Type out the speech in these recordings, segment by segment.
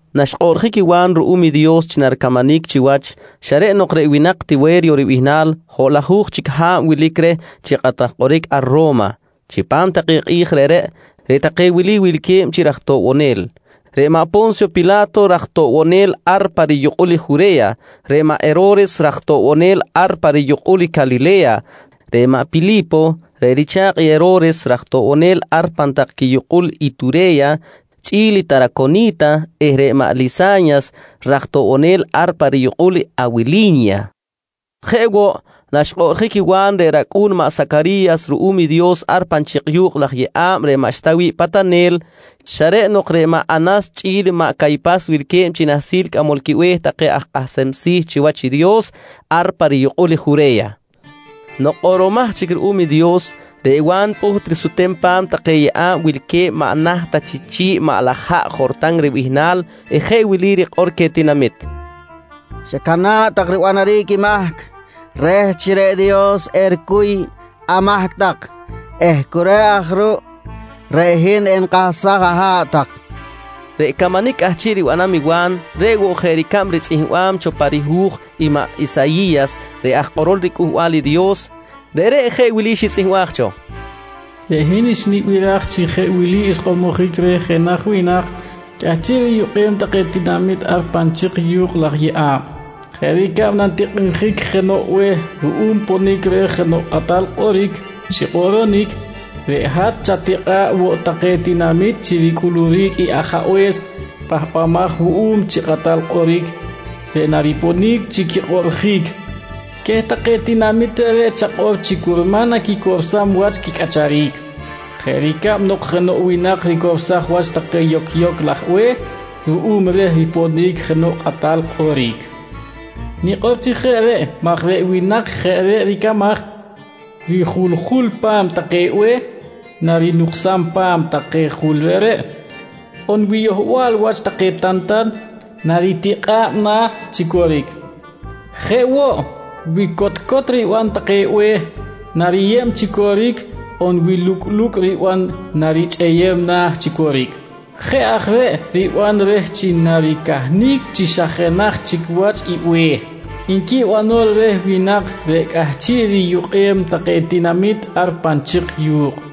Naxkꞌoꞌrjic i Wa̱n ruꞌum i Dios chi naricamanic chiwach, xa reꞌ nok reꞌ winak Tiwe̱ryo ribihnal hoꞌlajuj chic ha̱b wilic reh chi kꞌatal kꞌoric ar Ro̱ma. Chipam take kꞌi̱j reꞌreꞌ, reꞌ take wili wilque̱b chi raj toꞌbonel: Reꞌ maꞌ Po̱nsyo Pila̱to raj toꞌbonel ar pa riyukꞌul i Jure̱ya, reꞌ maꞌ Hero̱res raj toꞌbonel ar pa riyukꞌul i Calile̱ya, reꞌ maꞌ Pili̱po reꞌ richa̱kꞌ i Hero̱res raj toꞌbonel ar pan tak quiyukꞌul Iture̱ya chꞌi̱l Taraconi̱ta, eh reꞌ maꞌ Lisa̱nyas raj toꞌbonel ar pa riyukꞌul i Awili̱nya. Jeꞌ woꞌ, naxkꞌoꞌrjic i Wa̱n reꞌ racꞌu̱n maꞌ Sacari̱yas ruꞌum i Dios ar pan chik yu̱kꞌ laj yeꞌa̱b reꞌ maꞌxta wi̱ꞌ patanel, xa reꞌ nok reꞌ maꞌ Anas chꞌi̱l maꞌ Caypas wilque̱b chi nahsil cꞌamol quibe̱h take aj kꞌahsem si̱ chiwach i Dios ar pa riyukꞌul i Jure̱ya. Nok kꞌoꞌromaj chic ruꞌum i Dios, reꞌ Wa̱n pꞌuht risutem pa̱m take yeꞌa̱b wilque̱b maꞌ naht ta chi chi̱ꞌ i maꞌ laj haꞌ Jortan ribihnal eh jeꞌ wili rikꞌor queh tinamit: «Chacana̱ꞌ tak ribanaric i mahc reh chi reꞌ Dios ericuy amahc tak eh cu reꞌ aj ruꞌ reꞌ hin enikahsaj aha̱ꞌ tak, nqui queh. Reꞌ camanic cꞌahchiꞌ ribanam i Wa̱n, reꞌ woꞌ jeꞌ ricab ritzꞌihmbam cho pa rihu̱j i maꞌ Isayi̱yas reꞌ aj kꞌorol riCꞌuhbal i Dios. Reꞌreꞌ jeꞌ wili xitzꞌihmbaj cho: “Reꞌ hin xnibiraj chi jeꞌ wili xkꞌormojic reh jenaj winak cꞌahchiꞌ riyukꞌem take tinamit ar pan chik yu̱kꞌ laj yeꞌa̱b: ‘Jeꞌ ricab nantikꞌinjic jenoꞌ be̱h ruꞌum ponic reh jenoꞌ kꞌatal kꞌoric chi kꞌoꞌronic, reꞌ hat chatikꞌa̱ꞌ woꞌ take tinamit chi ricꞌuluric i Ajabe̱s Pahbamaj wuꞌum chi Kꞌatal Kꞌoric reꞌ nariponic chi quikꞌoꞌrjic. Queh take tinamit reꞌreꞌ chakꞌor chi curman naquicorsam wach quicꞌacharic jeꞌ ricab nok jenoꞌ winak ricorsaj wach take yocyoc laj be̱h ruꞌum reh riponic jenoꞌ kꞌatal kꞌoric. Nikꞌor chi jeꞌ reꞌ maj reꞌ winak jeꞌ reꞌ ricamaj, wi juljul pa̱m take be̱h, narinuksam pa̱m take jul reꞌreꞌ, on wi yohbal wach take tantan, naritikꞌa̱b na̱ chi coric. Jeꞌ woꞌ, wi cotcot riban take be̱h, nariyeb chi coric on wi lucꞌlucꞌ riban narichꞌeyem na̱ chi coric. Jeꞌ aj reꞌ riban reh chi naricahnic chi xa jenaj chic wach i be̱h, nqui banol reh winak reꞌ cꞌahchiꞌ riyukꞌem take tinamit ar pan chik yu̱kꞌ.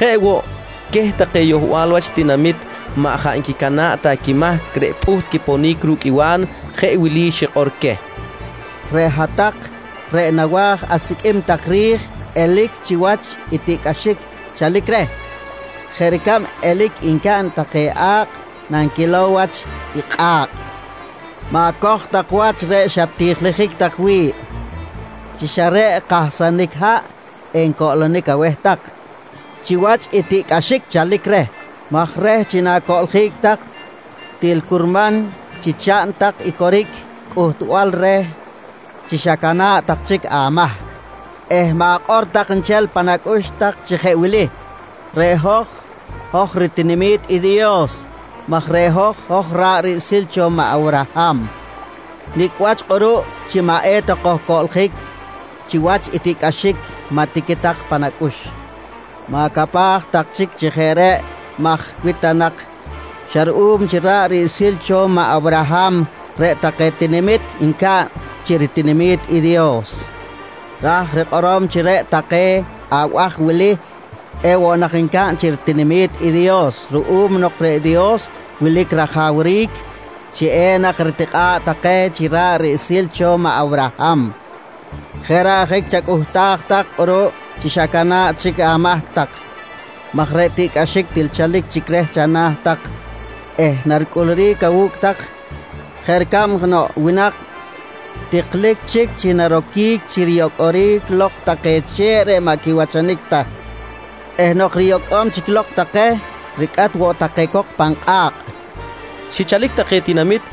Jeꞌ woꞌ, queh take yohbal wach tinamit maꞌ jaꞌ nquicana̱ꞌ ta quimahc reꞌ pꞌuht quiponic ru̱cꞌ i Wa̱n, jeꞌ wili xikꞌor queh: «Reꞌ hat-tak reꞌ nawa̱j asiqꞌuim tak ri̱j elic chiwach i tiꞌcꞌaxic chalic reh, jeꞌ ricab elic ncaꞌn take a̱kꞌ nanquilow wach i kꞌa̱kꞌ, ma̱coj tak wach reꞌ xat-tijiljic tak wi̱ꞌ chi xa reꞌ kahsanic haꞌ encoꞌlonic aweh tak chiwach i tiꞌcꞌaxic chalic reh maj reh chi na̱coꞌljic tak, til curman chi chaꞌn tak i coric cꞌuhtbal reh chi xacana̱ꞌ tak chic amahc eh ma̱kꞌor tak nchel pan acꞌux tak chi jeꞌ wili: ‹Reꞌ hoj, hoj ritinami̱t i Dios maj reꞌ hoj, hoj ra̱ꞌ riꞌsil cho maꞌ Awraham. Nicꞌ wach kꞌuruꞌ chi maꞌ eta kojcoꞌljic chiwach i tiꞌcꞌaxic? maꞌ tiqui tak pan acꞌux. «Ma̱capaj tak chic chi jeꞌ reꞌ maj wi ta nak xa ruꞌum chi ra̱ꞌ riꞌsil cho maꞌ Awraham, reꞌ take tinamit encaꞌn chi ritinami̱t i Dios, ra̱j rikꞌorom chi reꞌ take abaj wili ewoꞌ nak ncaꞌn chi ritinami̱t i Dios ruꞌum nok reꞌ Dios wilic rajawric chi enak ritikꞌa̱ꞌ take chi ra̱ꞌ riꞌsil cho maꞌ Awraham. Jeꞌ reꞌ ajic chacꞌuhtaj tak kꞌuruꞌ chi xacana̱ꞌ chic amahc tak maj reꞌ tiꞌcꞌaxic til chalic chic reh chana̱ tak eh naricꞌuluric awu̱cꞌ tak jeꞌ ricab jenoꞌ winak tiklic chic chi naroquic chi riyocꞌoric lok take che̱ꞌ maꞌ quiwachanic ta eh nok riyocꞌom chic lok take ricꞌat woꞌ take cok pan kꞌa̱kꞌ, nqui Wa̱n queh tinamit.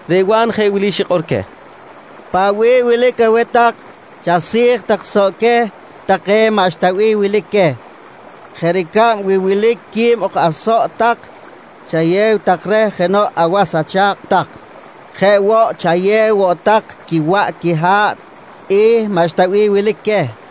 Reꞌ Wa̱n jeꞌ wili xikꞌor queh: «Paꞌ bih wilic aweh tak chasi̱j tak soꞌ queh take maꞌxta bih wilic queh. Jeꞌ ricab, wi wilic quib ok asoꞌ tak, chayew tak reh jenoꞌ awas acha̱kꞌ tak. Jeꞌ woꞌ, chayew woꞌ tak quiwaꞌ quiha̱ꞌ i maꞌxta bih wilic queh, nqui Wa̱n.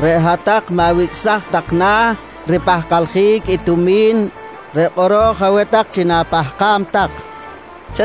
—Reꞌ hat-tak maꞌ wicꞌsaj tak na̱ ripahkaljic i tumi̱n reꞌ kꞌoro̱j aweh tak chi na̱pahkam tak, nqui queh.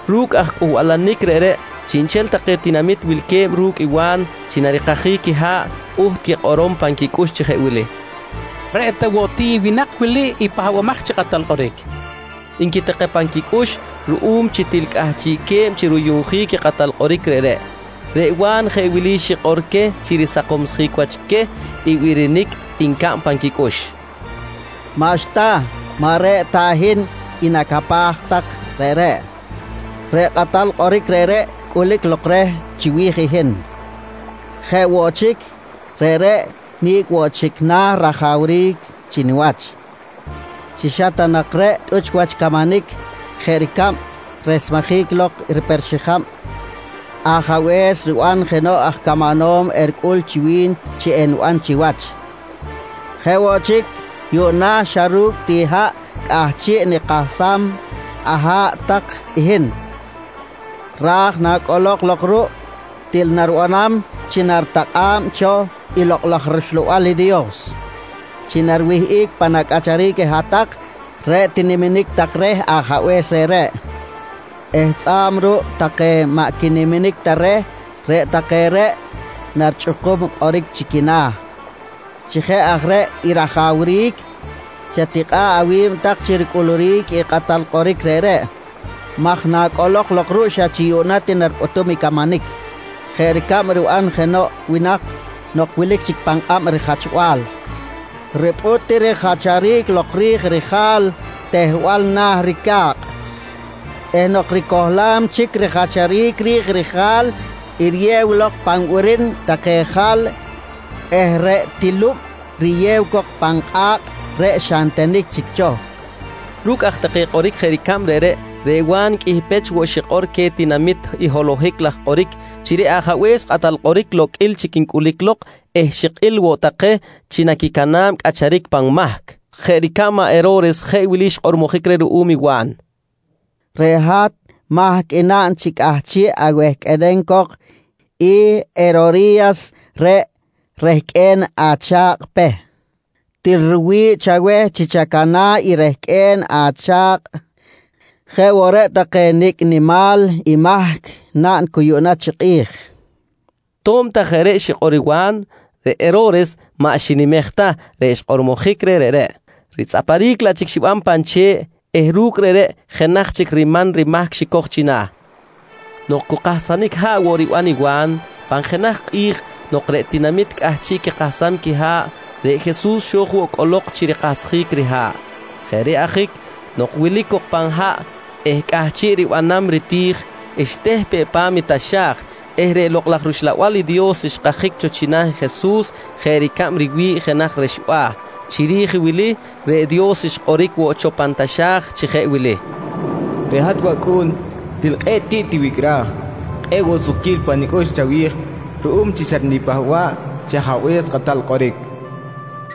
Ru̱cꞌ aj cꞌuhbalanic reꞌreꞌ, chiꞌnchel take tinamit wilque̱b ru̱cꞌ i Wa̱n chi narikajic quiha̱ꞌ pꞌuht quikꞌorom pan quicꞌux chi jeꞌ wili: «Reꞌ ta woꞌ ti i winak wili i Pahbamaj chi Kꞌatal Kꞌoric? nqui take pan quicꞌux ruꞌum chi til cꞌahchiꞌque̱b chi ruyuꞌnjic i kꞌatal kꞌoric reꞌreꞌ. Reꞌ Wa̱n jeꞌ wili xikꞌor queh chi risakomsjic wach queh i birinic ncaꞌn pan quicꞌux: «Maꞌxta, maꞌ reꞌ ta hin i nacapaj tak reꞌreꞌ. Reꞌ kꞌatal kꞌoric reꞌreꞌ cꞌulic lok reh chiwi̱j hin. Jeꞌ woꞌ chic, reꞌreꞌ nicꞌ woꞌ chic na̱ rajawric chi niwach, chi xa ta nak reꞌ tꞌuch wach camanic jeꞌ ricab resmejic lok riper xijab ajabe̱s riban jenoꞌ aj camanom, ericꞌul chi wi̱n chi eniban chiwach. Jeꞌ woꞌ chic, yuꞌna xa ru̱cꞌ ti haꞌ cꞌahchiꞌ nikahsam aha̱ꞌ tak i hin, ra̱j nacꞌolok lok ruꞌ, til naribanam chi naritakꞌa̱b cho i Lokꞌ laj rUxlabal i Dios chi nariwihꞌic pan acꞌacharic hat-tak reꞌ tiniminic tak reh Ajabe̱s reꞌreꞌ eh tzꞌa̱b ruꞌ take maꞌ quiniminic ta reh, reꞌ take reꞌ narichꞌukum kꞌoric chi quina̱. «Chi jeꞌ aj reꞌ i rajawric, chatikꞌa̱ꞌ awi̱b tak chi ricꞌuluric i kꞌatal kꞌoric reꞌreꞌ maj nacꞌolok lok ruꞌ, xa chi yuꞌna ti naripꞌutum camanic jeꞌ ricab riban jenoꞌ winak nok wilic chic pan kꞌab rijachbal, ripꞌut ti rijacharic lok ri̱j rija̱l tehbal na̱ i rica̱kꞌ eh nok ricohlam chic rijacharic ri̱j rija̱l, riyew lok pan birin take jal eh reꞌ tilub riyew cok pan kꞌa̱kꞌ reꞌ xa ntenic chic cho, nqui queh. Ru̱cꞌ aj take kꞌoric jeꞌ ricab reꞌreꞌ, reꞌ Wa̱n qꞌuih pech woꞌ xikꞌor queh tinamit i holohic laj kꞌoric chi reꞌ Ajabe̱s Kꞌatal Kꞌoric loqꞌuil chic ncꞌulic lok eh xikꞌil woꞌ take chi naquicana̱b cꞌacharic pan mahc. Jeꞌ ricab maꞌ Hero̱res jeꞌ wili xkꞌormojic reh ruꞌum i Wa̱n: «Reꞌ hat mahc i naꞌn chi cꞌahchiꞌ awehqꞌuenem cok i Herori̱yas reꞌ rehqꞌue̱n acha̱kꞌ Peh. Til riwi̱ꞌ chaweh chi chacana̱ꞌ i rehqꞌue̱n acha̱kꞌ jeꞌ woꞌ reꞌ take nicꞌ nimal i mahc naꞌn cu yuꞌna chi kꞌi̱j, nqui reh. To̱b ta jeꞌ reꞌ xikꞌor i Wa̱n, reꞌ Hero̱res maꞌ xinimej ta reꞌ xkꞌormojic reh reꞌreꞌ, ritzꞌaparic laꞌ chic xiban pan che̱ꞌ eh ru̱cꞌ reꞌreꞌ jenaj chic riman rimahc xicoj china̱. Nok cu kahsanic haꞌ woꞌ riban i Wa̱n, pan jenaj kꞌi̱j nok reꞌ tinamit cꞌahchiꞌ quikahsam quiha̱ꞌ, reꞌ Jesus xo̱j woꞌ cꞌolok chi rikahsjic riha̱ꞌ. Jeꞌ reꞌ ajic nok wilic cok pan haꞌ eh cꞌahchiꞌ ribanam riti̱j, xteh peꞌ pa̱m i taxa̱j eh reꞌ Lokꞌ laj rUxlabal i Dios xkajic cho china̱ i Jesus jeꞌ ricab riwi̱ꞌ jenaj rexba̱. Chiri̱j wili, reꞌ Dios xkꞌoric woꞌ cho pan taxa̱j chi jeꞌ wili: «Reꞌ hat wAcꞌu̱n, til kꞌe̱ꞌ tiꞌ tiwicꞌraj. Kꞌe̱ꞌ woꞌ sukquil pa nicꞌux chawi̱j ruꞌum chi xatnipahba̱ꞌ chi Ajabe̱s Kꞌatal Kꞌoric, nqui cho Dios.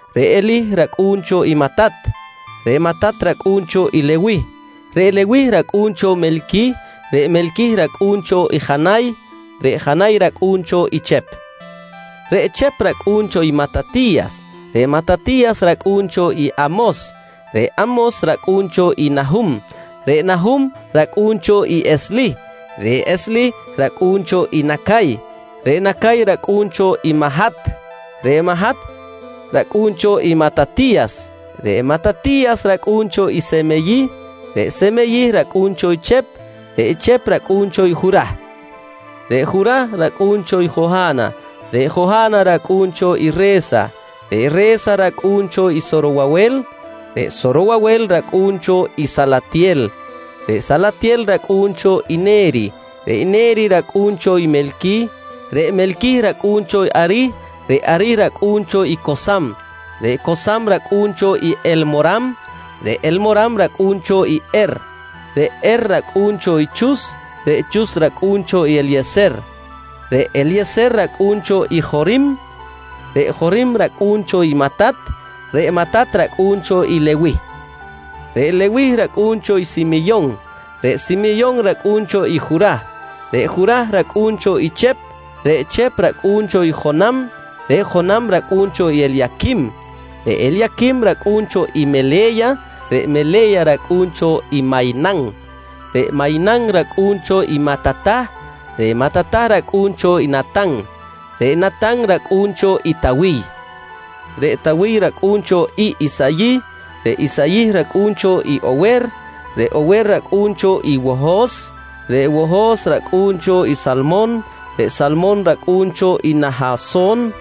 reꞌ Elih racꞌu̱n cho i Matat; reꞌ Matat racꞌu̱n cho i Lewih; reꞌ Lewih racꞌu̱n cho Melquih; reꞌ Melquih racꞌu̱n cho i Janay; reꞌ Janay racꞌu̱n cho i Chep; reꞌ Chep racꞌu̱n cho i Matati̱yas; reꞌ Matati̱yas racꞌu̱n cho i Amos; reꞌ Amos racꞌu̱n cho i Nahum; reꞌ Nahum racꞌu̱n cho i Eslih; reꞌ Eslih racꞌu̱n cho i Nacay; reꞌ Nacay racꞌu̱n cho i Mahat; reꞌ Mahat racꞌu̱n cho i Matati̱yas; reꞌ Matati̱yas racꞌu̱n cho i Semeyih; reꞌ Semeyih racꞌu̱n cho i Chep; reꞌ Chep racꞌu̱n cho i Jurah; reꞌ Jurah racꞌu̱n cho i Joha̱na; reꞌ Joha̱na racꞌu̱n cho i Re̱sa; reꞌ Re̱sa racꞌu̱n cho i Sorowawel. Reꞌ Sorowawel racꞌu̱n cho i Salatyel; reꞌ Salatyel racꞌu̱n cho i Ne̱ri; reꞌ Ne̱ri racꞌu̱n cho i Me̱lqui; reꞌ Me̱lqui racꞌu̱n cho i Arih reꞌ Arih racꞌu̱n cho i Cosam; reꞌ Cosam racꞌu̱n cho i Elmoram; reꞌ Elmoram racꞌu̱n cho i Er; reꞌ Er racꞌu̱n cho i Chus reꞌ Chus racꞌu̱n cho i Elye̱ser; reꞌ Elye̱ser racꞌu̱n cho i Jorim; reꞌ Jorim racꞌu̱n cho i Matat; reꞌ Matat racꞌu̱n cho i Lewih; reꞌ Lewih racꞌu̱n cho i Simyon; reꞌ Simyon racꞌu̱n cho i Jurah; reꞌ Jurah racꞌu̱n cho i Chep; reꞌ Chep racꞌu̱n cho i Jonam; reꞌ Jonam racꞌu̱n cho i Elyaquim; reꞌ Elyaquim racꞌu̱n cho i Mele̱ya; reꞌ Mele̱ya racꞌu̱n cho i Maynan; reꞌ Maynan racꞌu̱n cho i Matatah; reꞌ Matatah racꞌu̱n cho i Natan; reꞌ Natan racꞌu̱n cho i Tawiy. Reꞌ Tawiy racꞌu̱n cho i Isayih; reꞌ Isayih racꞌu̱n cho i Ower; reꞌ Ower racꞌu̱n cho i Wohos; reꞌ Wohos racꞌu̱n cho i Salmon; reꞌ Salmon racꞌu̱n cho i Nahason;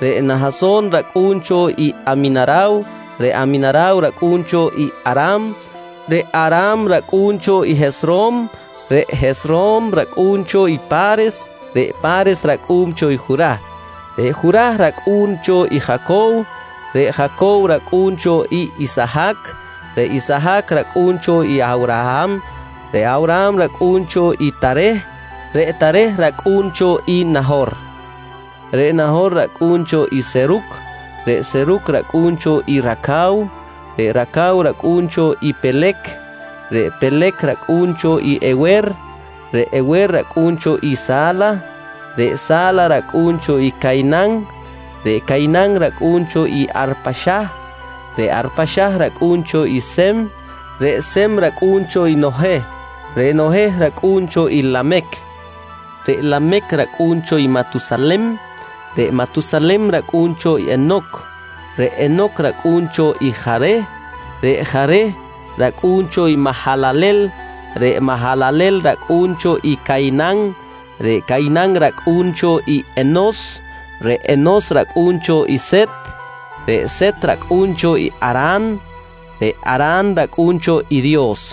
reꞌ Nahason racꞌu̱n cho i Aminaraw; reꞌ Aminaraw racꞌu̱n cho i Aram; reꞌ Aram racꞌu̱n cho i Hesrom; reꞌ Hesrom racꞌu̱n cho i Pa̱res; reꞌ Pa̱res racꞌu̱n cho i Jurah; reꞌ Jurah racꞌu̱n cho i Jacow; reꞌ Jacow racꞌu̱n cho i Isahac; reꞌ Isahac racꞌu̱n cho i Awraham. Reꞌ Awraham racꞌu̱n cho i Tareh; reꞌ Tareh racꞌu̱n cho i Naho̱r; reꞌ Naho̱r racꞌu̱n cho i Seruc; reꞌ Seruc racꞌu̱n cho i Racaw; reꞌ Racaw racꞌu̱n cho i Pelec; reꞌ Pelec racꞌu̱n cho i Ewer; reꞌ Ewer racꞌu̱n cho i Sa̱la; reꞌ Sa̱la racꞌu̱n cho i Caynan; reꞌ Caynan racꞌu̱n cho i Arpaxah; reꞌ Arpaxah racꞌu̱n cho i Sem. Reꞌ Sem racꞌu̱n cho i Noheh; reꞌ Noheh racꞌu̱n cho i Lamec; reꞌ Lamec racꞌu̱n cho i Matusalem; reꞌ Matusalem racꞌu̱n cho i Henoc; reꞌ Henoc racꞌu̱n cho i Jareh; reꞌ Jareh racꞌu̱n cho Mahalalel; reꞌ Mahalalel racꞌu̱n cho i Caynan; reꞌ Caynan racꞌu̱n cho i Enos; reꞌ Enos racꞌu̱n cho i Set; reꞌ Set racꞌu̱n cho i Aran; reꞌ Aran racꞌu̱n cho i Dios.